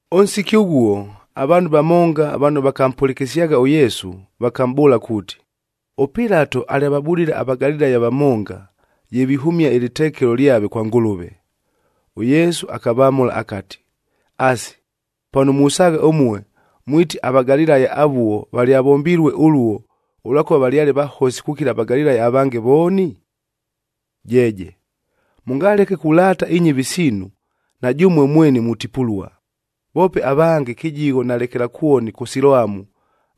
Ʉnsiki ʉghuo, avaanhu vamonga vano vakampʉlɨkɨsyagha ʉYesu, vakamʼbʉʉla kuuti, ʉPilato alyavabudile aVagalilaya vamonga, ye vihʉmia ɨlɨtekelo lyave kwa Ngʉlʉve. ɄYesu akavamʉla akati, “Asi, pano musaagha ʉmue, mwiti aVagalilaya avuo valyavombilue ʉluo, ʉlwakʉva valyale vahosi kukila aVagalilaya avange vooni? Jeeje! Mʉngaleke kulaata inyɨvi siinu, na jʉmue mweni mutipulua! Voope avange kɨjigho na lekelakwoni kʉ Siloamu,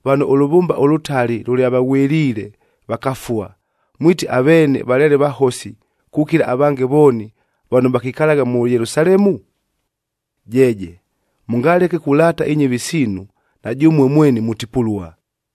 vano ʉlʉvʉmba ʉlʉtali lʉlyavaghwɨliile, vakafua, mwiti aveene valyale vahosi kukila avange vooni, vano vakikalagha mʉ Yelusalemu? Jeeje! Mʉngaleke kulaata inyɨvi siinu, na jʉmue mweni mutipulua!”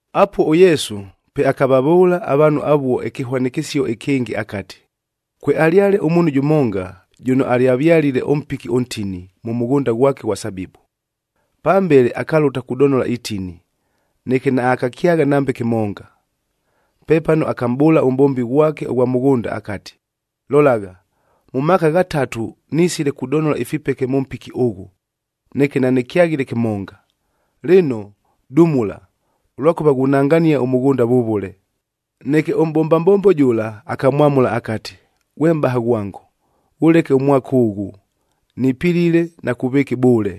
Apuo ʉYesu, pe akavavʉʉla avaanhu avuo ɨkɨhwanɨkɨsio ɨkɨngɨ akati, “Kwealyale ʉmuunhu jʉmonga, jʉno alyavyalile ʉmpiki ʉntini, mʉ mʉghʉnda ghwake ʉghwa sabibu. Pambele akalʉta kudonola itini, neke naakakyagha nambe kɨmonga. Pepano akamʼbʉʉla ʉmʼbombi ghwake ʉghwa mʉghʉnda akati, ‘Lolagha, mʉ maaka ghatatu nisile kudonola ifipeke mʉ mpiki ʉghʉ, neke nanɨkyaghile kɨmonga! Lɨno, dumula, ʉlwakʉva ghunangania ʉmʉghʉnda vʉvʉle!’ “Neke ʉmʼbomba mbombo jʉla, akamwamʉla akati, ‘Ghwe mʼbaha ghwango, ghʉleke ʉmwaka ʉghʉ, nipilile na kuvɨɨka ɨbʉʉle,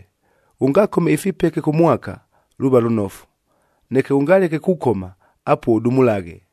ghʉngakome ifipeke kʉ mwaka, luuva lʉnofu! Neke ghʉngaleke kukoma, apuo ʉdumulaghe.’”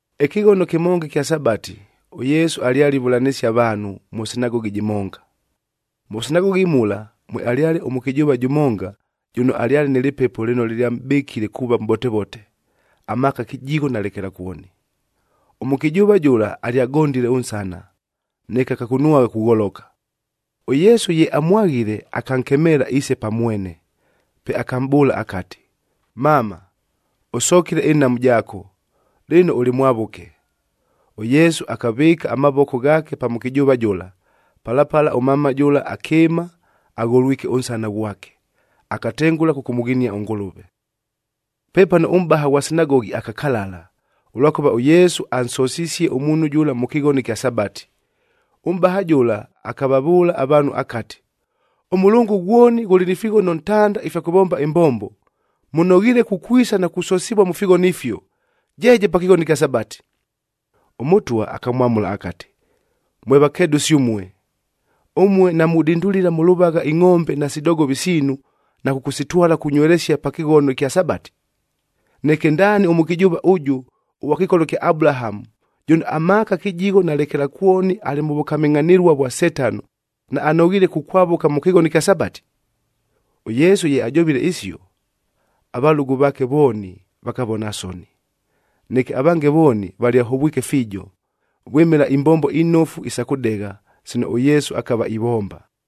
Ɨkɨghono kɨmonga ɨkya Sabati, ʉYesu alyale ivʉlanɨsia avaanhu, mʉ sinagogi jɨmonga. Mʉ sinagogi mula, mwealyale ʉmʉkɨjʉʉva jʉmonga, jʉno alyale nɨ lɨpepo lɨno lɨlyamʼbɨkile kuuva mʼbotevote, amaaka kɨjigho na lekelakwoni. Ʉmʉkɨjʉʉva jʉla alyagondile ʉnsana, neke akakunwagha kugholoka. ɄYesu ye amwaghile, akankemeela iise pa mwene. Pe akamʼbʉʉla akati, “Mama, ʉsokile ɨnhamu jaako, lɨno ʉlɨ mwavʉke!” ɄYesu akavɨɨka amavoko ghaake pa mʉkɨjʉʉva jʉla, pala pala ʉmama jʉla akɨɨma agholwike ʉnsana ghwake, akatengʉla kʉkʉmʉghinia ʉNgʉlʉve. Pepano ʉmʼbaha ghwa sinagogi akakalala, ʉlwakʉva ʉYesu ansosisie ʉmuunhu jʉla mʉ kɨghono ɨkya Sabati. Ʉmʼbaha jʉla akavavʉʉla avaanhu akati, “Ʉmʉlʉngʉ ghwoni ghʉlɨ ni fighono ntanda ifya kʉvomba ɨmbombo. Mʉnoghiile kukwisa na kusosivua mʉ fighono ifio, jeeje pa kɨghono ɨkya Sabati!” ɄMʉtwa akamwamʉla akati, “Mwe vakedʉsi ʉmue! Ʉmue namudindulila mʉ lʉvagha ingʼombe nasi dogovi siinu, na kʉkʉsitwala kunywelesia pa kɨghono ɨkya Sabati? Neke ndaani ʉmʉkɨjʉʉva ʉjʉ, ʉghwa kɨkolo kya Abulahamu, jʉno amaaka kɨjigho na lekelakwoni alɨ mʉ vʉkamɨngʼhanɨlua vwa Setano, naanoghiile kukwavʉka mʉ kɨghono ɨkya Sabati?” ɄYesu ye ajovile isio, avalʉgʉ vaake vooni, vakavona soni. Neke avange vooni valyahovwike fiijo, vwɨmɨla imbombo inofu isa kʉdegha, sino ʉYesu akava ivomba.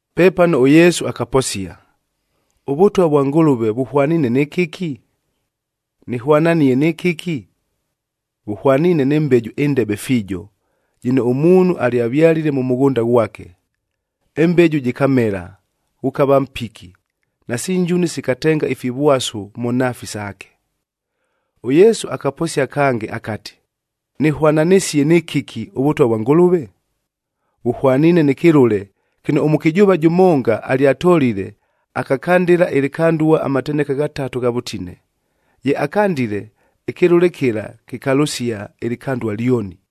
Pepano ʉYesu akaposia, “ɄVʉtwa vwa Ngʉlʉve vʉhwaniine nɨ kɨki? Nɨhwananie nɨ kɨki? Vʉhwaniine nɨ mbeju ɨndebe fiijo,a jɨno ʉmuunhu alyavyalile mʉ mʉghʉnda ghwake. Ɨmbeju jɨkamela, ghʉkava mpiki, nasi njuni sikatenga ifivwasu mʉ nhaafi saake.” ɄYesu akaposia kange akati, “Nɨhwananɨsie nɨ kɨki, ʉVʉtwa vwa Ngʉlʉve? Vʉhwaniine nɨ kɨlʉle kɨno ʉmʉkɨjʉʉva jʉmonga alyatolile, akakandɨla ɨlɨkandua amateneka ghatatu gha vʉtine. Ye akandile, ɨkɨlʉle kɨla kɨkalʉsia ɨlɨkandua lyoni.”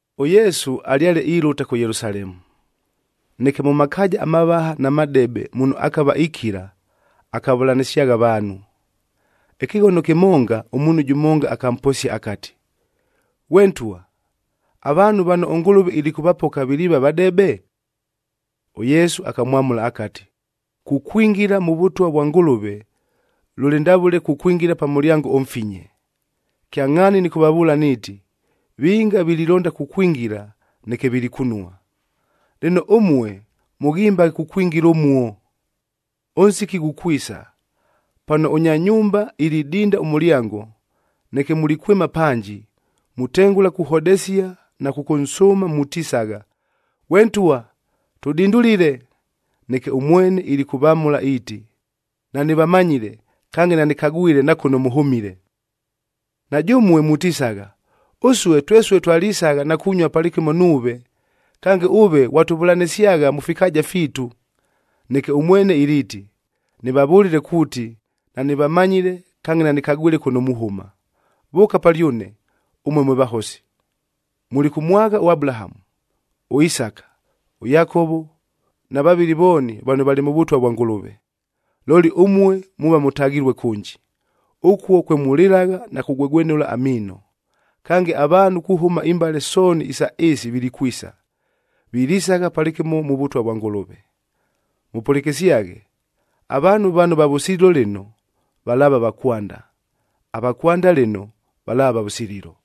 ɄYesu alyale ilʉta kʉ Yelusalemu. Neke mʉ makaaja amavaha na madebe muno akava ikila, akavʉlanɨsyagha avaanhu. Ɨkɨghono kɨmonga, ʉmuunhu jʉmonga akamposia akati, “Ghwe Ntwa, avaanhu vano ʉNgʉlʉve ilikʉvapoka viliiva vadebe?” ɄYesu akamwamʉla akati, “Kukwingila mʉ Vʉtwa vwa Ngʉlʉve, lʉlɨ ndavʉle kukwingila pa mʉlyango ʉmfinye. Kyangʼhaani nɨkʉvavʉʉla niiti, vinga vililonda kukwingila, neke vilikunua. Lɨno, ʉmue mʉghimbaghe kukwingila ʉmuo! Ʉnsiki ghukwisa, pano ʉnya nyumba ilidinda ʉmʉlyango, neke mulikwɨma panji, mutengʉla kuhodesia na kʉkʉnsʉʉma mutisagha, ‘Ghwe ntwa, tʉdindulile!’ Neke ʉmwene ilikʉvamʉla iiti, ‘Nanɨvamanyile kange nanɨkagwile na kʉno mʉhʉmile!’ “Na jʉmue mutisagha, ‘Ʉsue twesue twalisagha na kunyua palɨkɨmo nuuve! Kange, ʉve ghwatʉvʉlanɨsyagha mʉ fikaaja fiitu!’ Neke ʉmwene iliiti, ‘Nɨvavʉlile kuuti, nanɨvamanyile kange nanɨkagwile kʉno muhʉma! Vʉʉka palyʉne, ʉmue mwe vahosi!’ “Mulikʉmwagha ʉAbulahamu, ʉIsaka, ʉYakovo na vavɨli vooni valɨ mʉ Vʉtwa vwa Ngʉlʉve. Looli ʉmue muuva mʉtaghilue kʉnji. Ʉkuo kwe mulɨlagha na kugwegwenʉla amiino! Kange, avaanhu kuhʉma imbale sooni isa ɨɨsi vilikwisa, vilisagha palɨkɨmo mʉ Vʉtwa vwa Ngʉlʉve. “Mʉpʉlɨkɨsyaghe! Avaanhu vano va vʉsililo lɨno, valaava va kwanda; ava kwanda lɨno, valaava va vʉsililo.”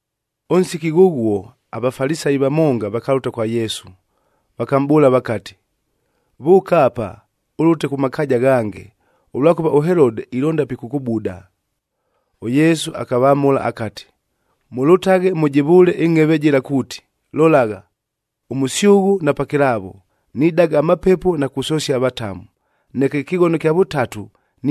Ʉnsiki ghʉghuo, aVafalisayi vamonga vakalʉta kwa Yesu, vakamʼbʉʉla vakati, “Vʉʉka apa, ʉlʉtaghe kʉ makaaja aghange, ʉlwakʉva ʉHelode ilonda pikʉkʉbuda.” ɄYesu akavamʉla akati, “Mʉlʉtaghe mʉjɨvʉʉle ɨngʼheve jɨla kuuti, ‘Lolagha, ʉmʉsyʉghʉ na pakɨlaavo, nidaga amapepo na kusosia avatamu, neke ɨkɨghono ɨkya vʉtatu,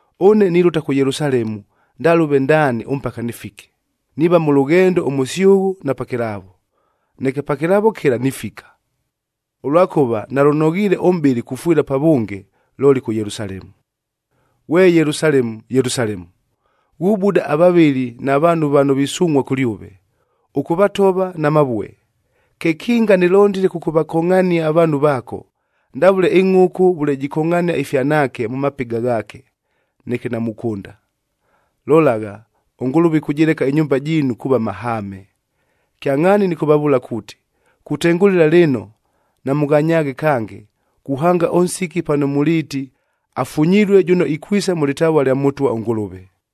Ʉne nilʉta kʉ Yelusalemu ndalʉve ndaani ʉmpaka nɨfike, niiva mʉ lʉghendo ʉmʉsyʉghʉ na pakɨlaavo, neke pakɨlaavo kɨla nifika. Ʉlwakʉva nalʉnoghiile ʉmʼbɨli kufwɨla pavʉnge, looli kʉ Yelusalemu!’ “Ghwe Yelusalemu, Yelusalemu! Ghubuda avavɨli na vaanhu vano visungʼhua kʉlyʉve, ʉkʉvatova na mavue. Kekinga nɨlondile kʉkʉvakongʼhania avaanhu vaako, ndavʉle ɨngʼhʉkʉ vʉle jikongʼhania ifyanaake mʉ mapɨga ghaake, neke namukʉnda. Lolagha, ʉNgʉlʉve ɨkʉjɨleka ɨnyumba jiinu kuuva mahaame! Kyangʼhaani nɨkʉvavʉʉla kuuti, kutengʉlɨla lɨno namʉnganyaaghe kange, kuhanga ʉnsiki pano muliiti, ‘Afunyilue jʉno ikwisa mʉ lɨtavua lya Mʉtwa ʉNgʉlʉve.’c”